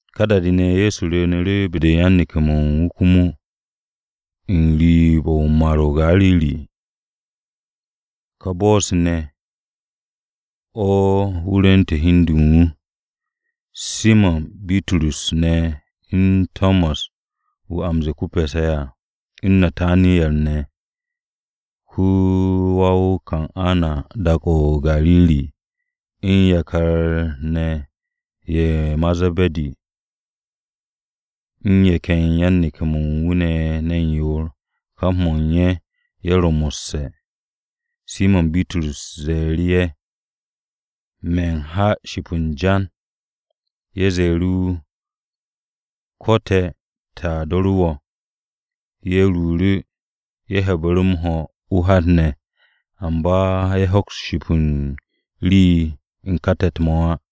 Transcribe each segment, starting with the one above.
Ka da-de ne̱, Ye̱so rwu̱u̱nu̱ru̱ be-de yan-neke̱-mo̱ u̱n wu̱ komo, n-riib u̱n Mar-o̱ o-Gariri. Ka bo̱-se ne̱, o̱ wu̱ rwu̱nte̱ hi u̱n de u̱n wu̱. Simo̱n Bitrus ne̱ u̱n Tomas (wu̱ a m-ze̱e̱ ko-Pe̱se̱ à), u̱n Nataniyar ne̱ (ko-wa-o-Kana dak-o̱ o-Gariri), u̱n yakar ne̱ ye̱ ma Ze̱be̱di, u̱n ye̱ ken yan-neke̱-mo̱ u̱n wu̱ ye̱ ne̱ ne̱n yoor, kap mo̱ u̱n ye̱ ye̱ ro mo̱sse̱. Simo̱n Bitrus ze̱e̱ru̱ ye̱, “Me̱n ha ship u̱n jan.” Ye̱ ze̱e̱ru̱ wu̱, “Ko̱ te̱ te̱a do̱ru̱ wo̱.” Ye̱ ruuru̱. Ye̱ he̱bu̱ru̱ m-ho̱ o-hat ne̱. Amba ye̱ hoks ship u̱n rii u̱n ka te̱t-mo̱ á.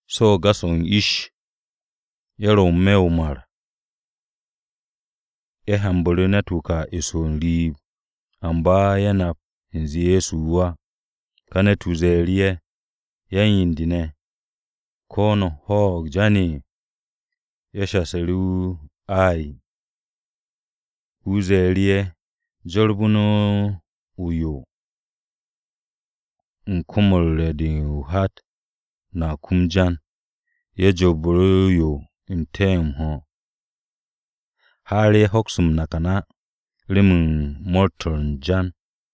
So̱ u̱n gas-o̱ u̱n ish, ye̱ ro̱ n-me̱ o-mar, ye̱ hyanbu̱ru̱ ne̱t-wu̱ ka eso n-riib, amba ye̱ nap u̱nze Ye̱so wu̱ á. Ye̱so ze̱e̱ru̱ ye̱, “Yan-yen-de ne̱, ¿ko̱ no̱ ho̱o̱g jan?” Ye̱ shasu̱ru̱ wu̱, “Ay.” Wu̱ ze̱e̱ru̱ ye̱, “Jorbu̱ no̱ o-yo u̱n kom-o̱ u̱r-re̱ de o-hat. No̱a kum jan.” Ye̱ jorbu̱ru̱ o-yo n-te̱ m-ho̱ har ye̱ hoks m-nakan á, remen mo̱o̱r-to̱ u̱n jan.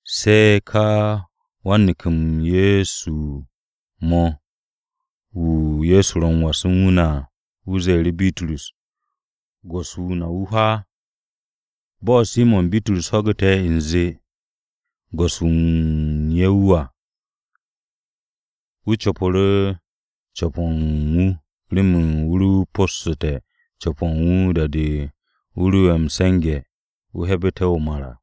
Se̱ ka wan-neke̱-mo̱ u̱n wu̱ mo̱ wu̱, wu̱ Ye̱so ro m-was u̱n wu̱ ne̱ à, wu̱ ze̱e̱ru̱ Bitrus, “Go̱s-wu̱ na wu̱ hwaa!” Bo̱ Simo̱n Bitrus ho̱gu̱te̱ u̱nze Go̱s-wu̱ wu̱ u̱n ye̱ wu̱ à, wu̱ co̱pu̱ru̱ co̱p-o̱ u̱n wu̱ remen wu̱ ro possu̱ssu̱te̱ co̱p-o̱ u̱n wu̱ da-de wu̱ ro'e̱ m-se̱nge̱, wu̱ 'he̱bu̱te̱ o-mar à.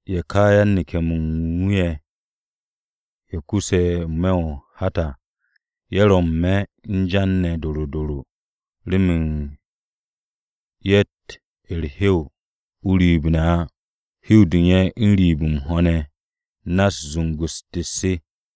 Ye̱ ka yan-neke̱-mo̱ u̱n wu̱ ye̱, ye̱ kuse̱ n-me̱ o-hat à, ye̱ ro n-me̱ u̱n jan ne̱ doro doro remen ye̱tt u̱r-hew o-riib ne̱ á. Hew-de u̱n ye̱ n-riib m-ho̱ ne̱ u̱s-na zungu-u̱s tet-se.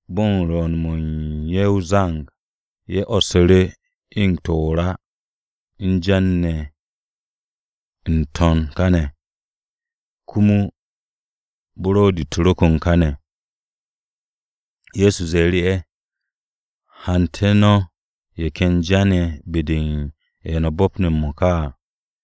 Bo̱ u̱n rwu̱u̱n-mo̱ u̱n ye̱ o-zang, ye̱ 'wo̱ssu̱ru̱ eng-to̱ o-ra o-jan ne̱ n-to̱n kane̱, komo buro̱di-u̱r ro kon kane̱. Ye̱so ze̱e̱ru̱ ye̱, “Hante̱ no̱ ye̱ ken jan-ye̱ be-de u̱n ye̱ no̱ bo̱pne̱ m-mo̱ka à.”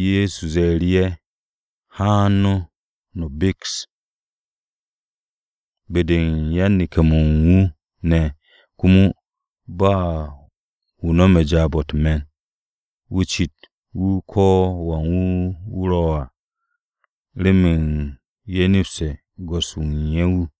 Ye̱so ze̱e̱ru̱ ye̱, “Haan no̱, no̱ beks.” Be-de yan-neke̱-mo̱ u̱n wu̱ ne̱ komo ba u̱n wu̱ no̱me̱ jaab-o̱ u̱t-me̱n, wu̱ cit wu̱ ko̱wan wu̱ wu̱ ro̱ à remen ye̱ nepste̱ Go̱s-wu̱ u̱n ye̱ wu̱.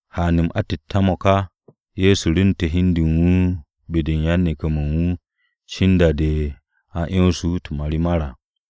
Haan-m atette̱-mo̱ ka Ye̱so rwu̱ntu̱te̱ hi u̱n de u̱n wu̱ be-de u̱n yan-neke̱-mo̱ u̱n wu̱ cin da-de a 'yonse̱ wu̱ u̱t-marimar à.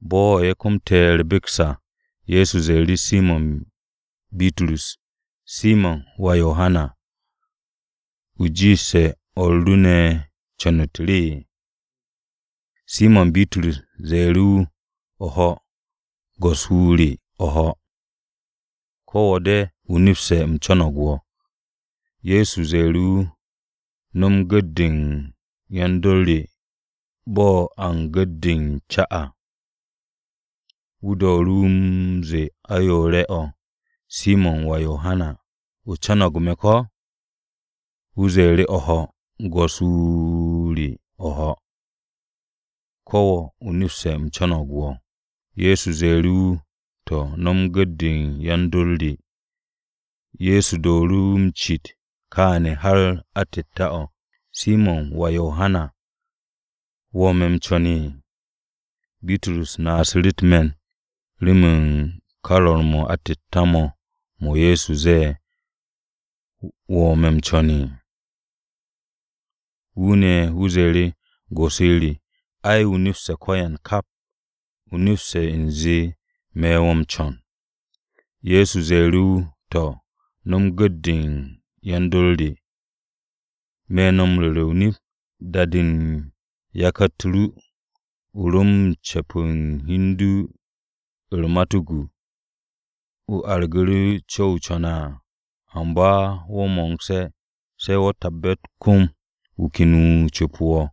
Bo̱ ye̱ komte̱ u̱r-beks à, Ye̱so ze̱e̱ru̱ Simo̱n Bitrus, “Simo̱n, wà Yohana, ¿wo̱ jiishe̱ o̱r ru ne̱ u̱n co̱n-u̱t re?” Simo̱n Bitrus ze̱e̱ru̱ wu̱, “O̱ho̱, Go̱s-wu̱ re o̱ho̱, ko̱ wo̱ de, o nepste̱ u̱m co̱no̱g wo̱.” Ye̱so ze̱e̱ru̱ wu̱, “No̱m gu̱t-de u̱n yan-dor re bo̱ a u̱n gu̱t-de u̱n ca à.” Wu̱ dooru̱ wu̱ m-ze̱e̱ ayoore̱-o̱, “Simo̱n, wà Yohana, ¿o co̱no̱g me̱, ko̱?” Wu̱ zee, “O̱ho̱, Go̱s-wu̱ re o̱ho̱, ko̱ wo̱, o nepste̱ u̱m co̱no̱g wo̱.” Ye̱so ze̱e̱ru̱ wu̱, “To̱, no̱m gu̱t-de u̱n yan-dor re.” Ye̱so dooru̱ wu̱ m-cit kááne̱ har atette̱-o̱, “Simo̱n, wà Yohana, ¿wo̱ me̱ m-co̱n?” Bitrus naasu̱ru̱ u̱t-me̱n remen ka rwo̱r-m atette̱-mo̱ mo̱ Ye̱so ze̱e̱, “¿Wo̱ me̱ co̱n?” Wu̱ ne̱, wu̱ ze̱e̱ru̱, “Go̱s-wu̱ re, ai, o nepste̱ ko̱yan kap. O nepste̱ ne̱ u̱nze me̱ wo̱ m-co̱n.” Ye̱so ze̱e̱ru̱ wu̱, “To̱, no̱m gu̱t-de u̱n yan-dor re. Me̱ no̱ m-ru̱re̱ o-nip, da-de u̱n yakar-u̱t ru o ro u̱n cu̱pe̱ u̱n hi u̱n du u̱t-matuku, o argu̱ru̱ co̱-o o co̱ne̱ à. Amba wo̱ mo̱ngse̱, se̱ wo̱ tabbe̱ u̱t-kom wu̱ ken wu̱ cu̱pu̱ wo̱,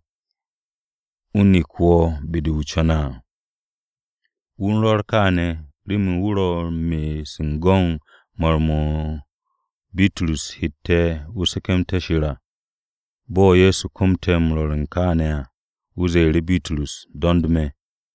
wu̱ nek wo̱ be-de wo̱ co̱ne̱ á.” (Wu̱ u̱n rwo̱r kááne̱ remen wu̱ ro m-me'es u̱n go̱n mar-mo̱ Bitrus hette̱ wu̱ se̱ke̱mste̱ Shir à). Bo̱ Ye̱so komte̱ m-rwo̱r kááne̱ à, wu̱ ze̱e̱ru̱ Bitrus, “Do̱nd me̱.”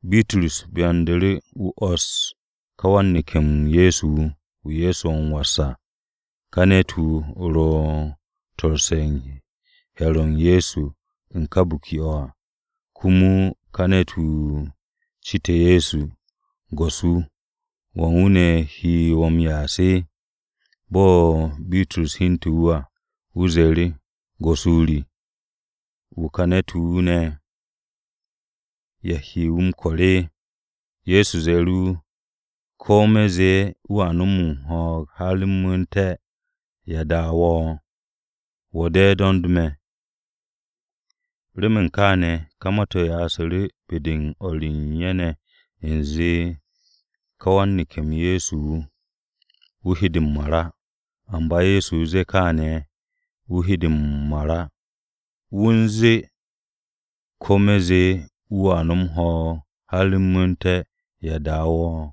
Bitrus byandu̱ru̱, wu̱ 'wo̱ss ka wan-neke̱-m Ye̱so wu̱, wu̱ Ye̱so ro m-was à. (Ka ne̱t-wu̱ ro to̱sse̱ u̱n he̱r-o Ye̱so u̱n ka biki-o̱ à. Komo ka ne̱t-wu̱ citu̱ru̱ Ye̱so, “Go̱s-wu̱, ¿wan-wu̱ ne̱ he wu̱ m-ya'as?”) Bo̱ Bitrus hyente̱ wu̱ à, wu̱ ze̱e̱ru̱ Ye̱so, “Go̱s-wu̱ re, ¿wu̱ ka ne̱t-wu̱ ne̱? ¿Ya he wu̱ m-ko̱r?” Ye̱so ze̱e̱ru̱ wu̱, “Ko̱ me̱ zee wu̱a nom ho̱o̱g har u̱m mu̱u̱nté̱, ¿ya daaru̱ wo̱? Wo̱ de̱, do̱nd me̱.” Remen káane̱ ka ma-to̱ yasu̱ru̱ be-de u̱n o̱r u̱n ye̱ ne̱ u̱nze ka wan-neke̱-m Ye̱so wu̱, wu̱ he de m-mar á. Amba Ye̱so zee káane̱ wu̱ he de m-mar á. Wu̱ u̱n ze̱e̱, “Ko̱ me̱n ze̱e̱ wu̱a nom ho̱o̱g har u̱m mu̱u̱nté̱, ¿ya daaru̱ wo̱?”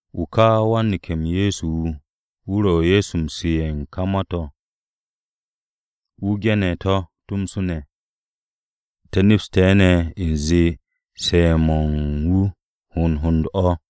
Wu̱, ka wan-neke̱-m Ye̱so wu̱, wu̱ ro̱ Ye̱so m-su̱ ye̱ u̱n ka ma-to̱. Wu̱ ge̱ne̱ to̱ tomso ne̱. Te̱ nepste̱ ne̱ u̱nze su̱'e̱-mo̱ u̱n wu̱ hond hond o̱.